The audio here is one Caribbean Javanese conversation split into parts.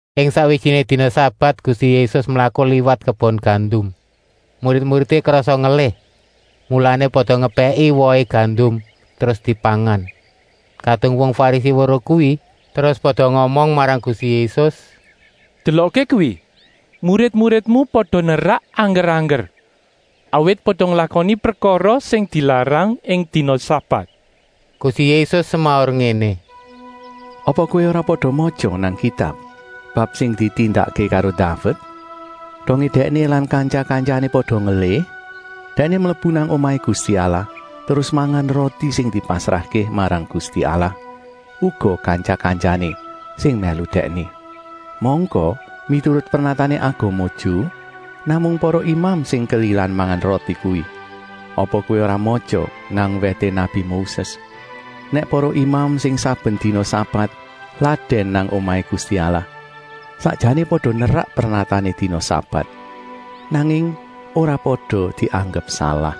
Ing sakwijiné dina sabat Gusti Yésus mlaku liwat kebon gandum. Murid-muridé krasa ngelih, mulané pada ngepèki wohé gandum terus dipangan. Kadung wong Farisi weruh kuwi, terus pada ngomong marang Gusti Yésus: “Delokké kuwi, murid-muridmu pada nerak angger-angger, awit pada nglakoni prekara sing dilarang ing dina sabat.” Gusti Yésus semaur ngéné: “Apa kowé ora pada matya nang Kitab bab sing ditindakké karo Daved, dongé dèkné lan kantya-kantyané pada ngelih? Dèkné mlebu nang omahé Gusti Allah terus mangan roti sing dipasrahké marang Gusti Allah, uga kantya-kantyané sing mèlu dèkné. Mangka miturut pernatané agama Ju namung para imam sing kelilan mangan roti kuwi. Apa kowé ora matya nang wèté nabi Moses nèk para imam sing saben dina sabat ladèn nang omahé Gusti Allah sakjané pada nerak pernatané dina sabat, nanging ora pada dianggep salah.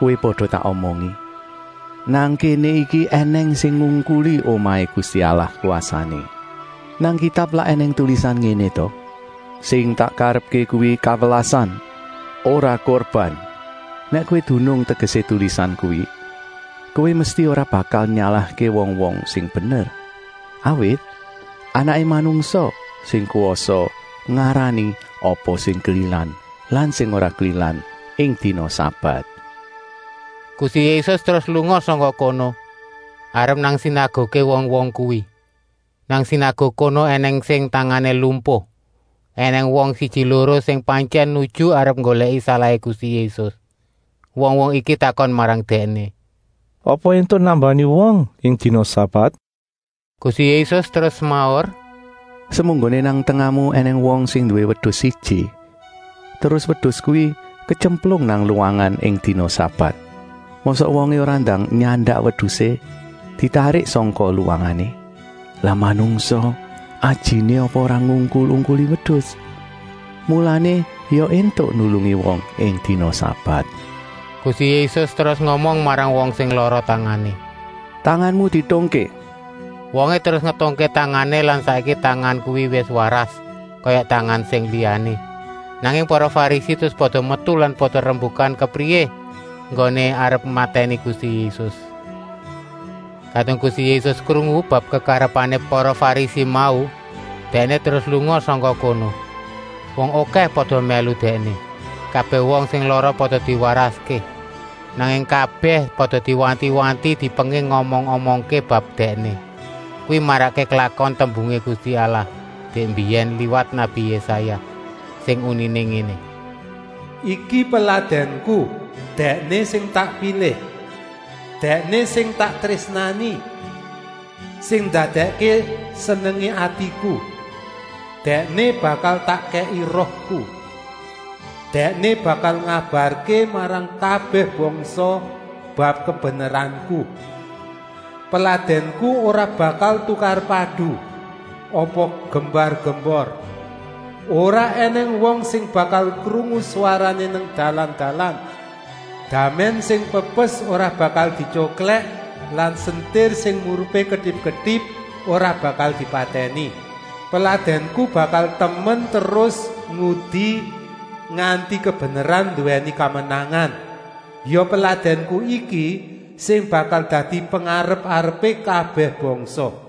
Kowé pada tak omongi: nang kéné iki ènèng sing ngungkuli omahé Gusti Allah kwasané. Nang Kitab lak ènèng tulisan ngéné ta: ‘Sing tak karepké kuwi kawelasan, ora kurban.’ Nèk kowé dunung tegesé tulisan kuwi, kowé mesti ora bakal nyalahké wong-wong sing bener. Awit Anaké Manungsa sing kwasa ngarani apa sing kelilan lan sing ora kelilan ing dina sabat.” Gusti Yésus terus lunga sangka kono arep nang sinaguké wong-wong kuwi. Nang sinaguk kono ènèng wong sing tangané lumpuh. Enèng wong siji-loro sing pantyèn nuju arep nggolèki salahé Gusti Yésus. Wong-wong iki takon marang Dèkné: “Apa éntuk nambani wong ing dina sabat?” Gusti Yésus terus semaur: “Semunggoné nang tengahmu ènèng wong sing nduwé wedus siji, terus wedus kuwi ketyemplung nang luwangan ing dina sabat. Mosok wongé ora ndang nyandak wedusé ditarik sangka luwangané? Lah manungsa ajiné apa ora ngungkul-ungkuli wedus? Mulané ya éntuk nulungi wong ing dina sabat.” Gusti Yésus terus ngomong marang wong sing lara tangané: “Tanganmu dietungké!” Wongé terus ngetungké tangané lan saiki tangan kuwi wis waras kaya tangan sing liyané. Nanging para Farisi terus pada metu lan pada rembukan kepriyé enggoné arep matèni Gusti Yésus. Kadung Gusti Yésus krungu bab kekarepané para Farisi mau, Dèkné terus lunga sangka kono. Wong okèh pada mèlu Dèkné. Kabèh wong sing lara pada diwaraské. Nanging kabèh pada diwanti-wanti, dipenging ngomong-omongké bab Dèkné. Kuwi marakké klakon tembungé Gusti Allah dèk mbiyèn liwat nabi Yésaya, sing uniné ngéné: “Iki Peladènku, Dèkné sing tak pilih. Dèkné sing tak trésnani, sing ndadèkké senengé atiku. Dèkné bakal tak kèki Rohku. Dèkné bakal ngabarké marang kabèh bangsa bab kabeneranku. Peladènku ora bakal tukar-padu apa gembar-gembor. Ora ènèng wong sing bakal krungu swarané nang dalan-dalan. Damèn sing pepes ora bakal dityoklèk lan sentir sing murupé ketip-ketip ora bakal dipatèni. Peladènku bakal temen terus ngudi nganti kabeneran nduwèni kamenangan. Ya Peladènku iki sing bakal dadi pengarep-arepé kabèh bangsa.”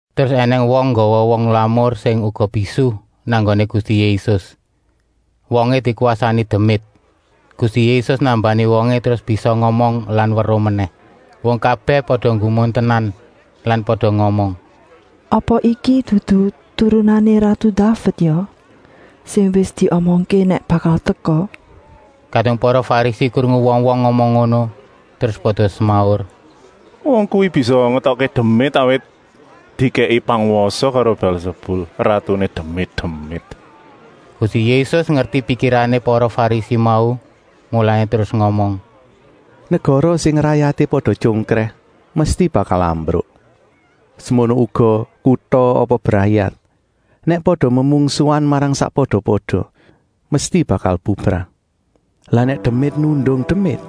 Terus ènèng wong nggawa wong lamur sing uga bisu nang nggoné Gusti Yésus. Wongé dikwasani demit. Gusti Yésus nambani wongé terus bisa ngomong lan weruh menèh. Wong kabèh pada nggumun tenan lan pada ngomong: “Apa iki dudu turunané ratu Daved ya, sing wis diomongké nèk bakal teka?” Kadung para Farisi krungu wong-wong ngomong ngono, terus pada semaur: “Wong kuwi bisa ngetokké demit, awit dikèki pangwasa karo Bèlsebul, ratuné demit-demit.” Gusti Yésus ngerti pikirané para Farisi mau, mulané terus ngomong: “Negara sing rayaté pada tyongkrèh mesti bakal ambruk. Semono uga kuta apa brayat, nèk pada memungsuhan marang sakpada-pada, mesti bakal bubrah. Lah nèk demit nundung demit,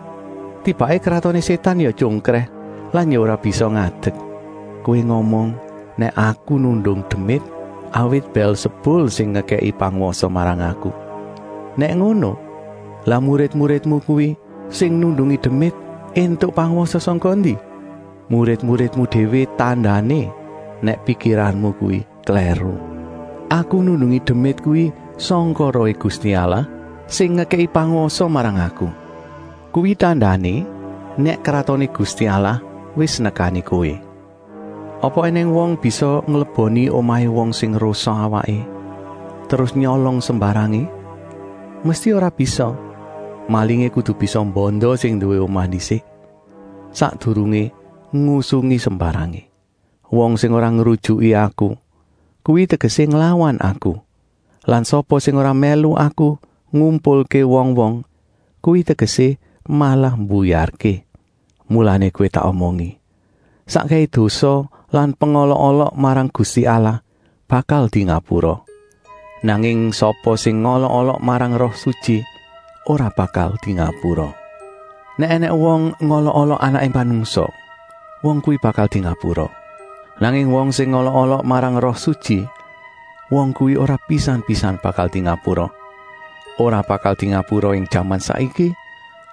tibaké kratoné Sétan ya tyongkrèh lan ya ora bisa ngadek? Kowé ngomong nèk Aku nundung demit, awit Bèlsebul sing ngekèki pangwasa marang Aku. Nèk ngono, lah murid-muridmu kuwi sing nundungi demit éntuk pangwasa sangka endi? Murid-muridmu déwé tandané nèk pikiranmu kuwi klèru. Aku nundungi demit kuwi sangka Rohé Gusti Allah, sing ngekèki pangwasa marang Aku. Kuwi tandané nèk Kratoné Gusti Allah wis nekani kowé. “Apa ènèng wong bisa ngleboni omahé wong sing rosa awaké terus nyolong sembarangé? Mesti ora bisa! Malingé kudu bisa mbanda sing nduwé omah ndisik, sakdurungé ngusungi sembarangé. “Wong sing ora ngrujuki Aku, kuwi tegesé nglawan Aku. Lan sapa sing ora mèlu Aku ngumpulké wong-wong, kuwi tegesé malah mbuyarké. Mulané kowé tak omongi: sakkèhé dosa lan pengolok-olok marang Gusti Allah bakal dingapura. Nanging sapa sing ngolok-olok marang Roh Sutyi ora bakal dingapura. Nèk ènèng wong ngolok-olok Anaké Manungsa, wong kuwi bakal dingapura. Nanging wong sing ngolok-olok marang Roh Sutyi, wong kuwi ora pisan-pisan bakal dingapura, ora bakal dingapura ing jaman saiki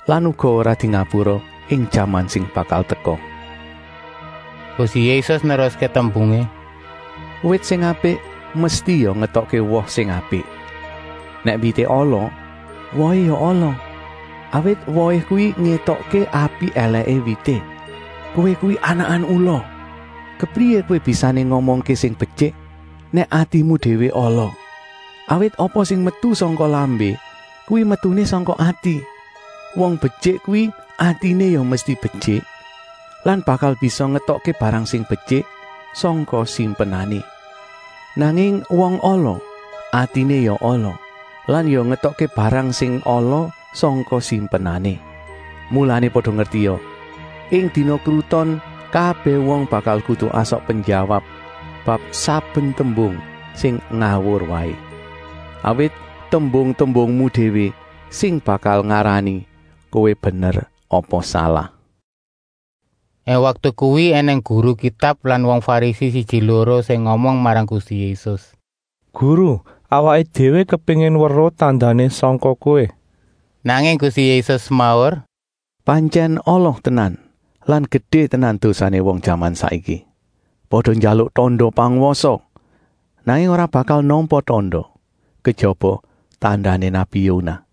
lan uga ora dingapura ing jaman sing bakal teka.” Gusti Yésus neruské tembungé: “Wit sing apik mesti ya ngetokké wong sing apik. Nèk wité ala, wohé ya ala. Awit wohé kuwi ngétokké apik-èlèké wité. Kowé kuwi anakan ula! Kepriyé kowé bisané ngomongké sing betyik, nèk atimu déwé ala? Awit apa sing metu sangka lambé, kuwi metuné sangka ati. Wong betyik kuwi atiné ya mesti betyik lan bakal bisa ngetokké barang sing betyik sangka simpenané. Nanging wong ala, atiné ya ala lan ya ngetokké barang sing ala sangka simpenané. “Mulané pada ngertia: ing dina kruton kabèh wong bakal kudu asok penjawab bab saben tembung sing ngawur waé. Awit tembung-tembungmu déwé sing bakal ngarani kowé bener apa salah.” Ing waktu kuwi ènèng guru Kitab lan wong Farisi siji-loro sing ngomong marang Gusti Yésus: “Guru, awaké déwé kepéngin weruh tandané sangka Kowé.” Nanging Gusti Yésus semaur: “Pantyèn ala tenan lan gedé tenan dosané wong jaman saiki. Pada njaluk tanda pangwasa, nanging ora bakal nampa tanda, kejaba tandané nabi Yonah.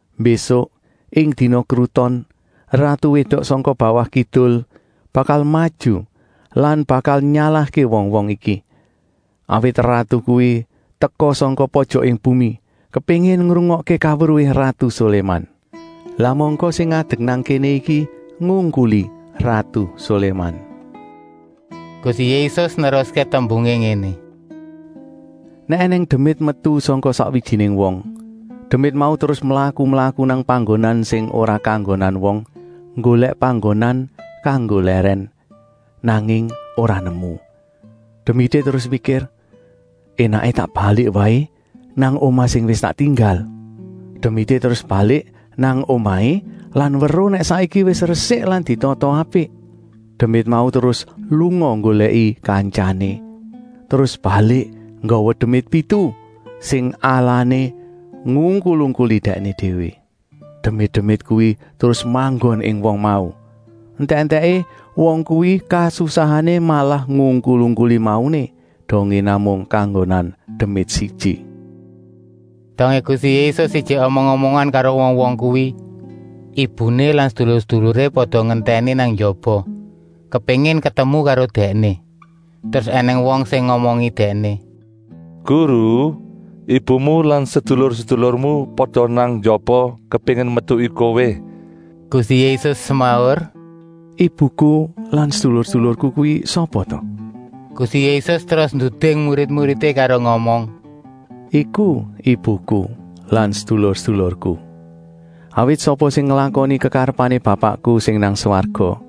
Mbésuk ing dina kruton ratu wédok sangka bawah kidul bakal maju lan bakal nyalahké wong-wong iki. Awit ratu kuwi teka sangka pojoké bumi, kepéngin ngrungokké kaweruhé ratu Soléman. Lah mangka sing ngadek nang kéné iki ngungkuli ratu Soléman.” Gusti Yésus neruské tembungé ngéné: “Nèk ènèng demit metu sangka sakwijiné wong, demit mau terus mlaku-mlaku nang panggonan sing ora kanggonan wong, nggolèk panggonan kanggo lèrèn, nanging ora nemu. Demité terus mikir: ‘Enaké tak balik waé nang omah sing wis tak tinggal.’ Demité terus balik nang omahé lan weruh nèk saiki wis resik lan ditata apik. Demit mau terus lunga nggolèki kantyané, terus balik nggawa demit pitu, sing alané ngungkul-ungkuli dèkné déwé. Demit-demit kuwi terus manggon ing wong mau. Entèk-entèké wong kuwi kasusahané malah ngungkul-ungkuli mauné, dongé namung kanggonan demit siji.” Dongé Gusti Yésus ijik omong-omongan karo wong-wong kuwi, ibuné lan sedulur-seduluré pada ngentèni nang njaba, kepéngin ketemu karo Dèkné. Terus ènèng wong sing ngomongi Dèkné: “Guru, ibumu lan sedulur-sedulurmu pada nang njaba, kepéngin metuki Kowé.” Gusti Yésus semaur: “Ibuku lan sedulur-sedulurku kuwi sapa ta?” Gusti Yésus terus nduding murid-muridé karo ngomong: “Iku ibuku lan sedulur-sedulurku! Awit sapa sing nglakoni kekarepané Bapakku sing nang swarga,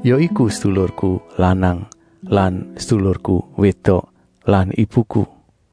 ya iku sedulurku lanang lan sedulurku wédok lan ibuku.”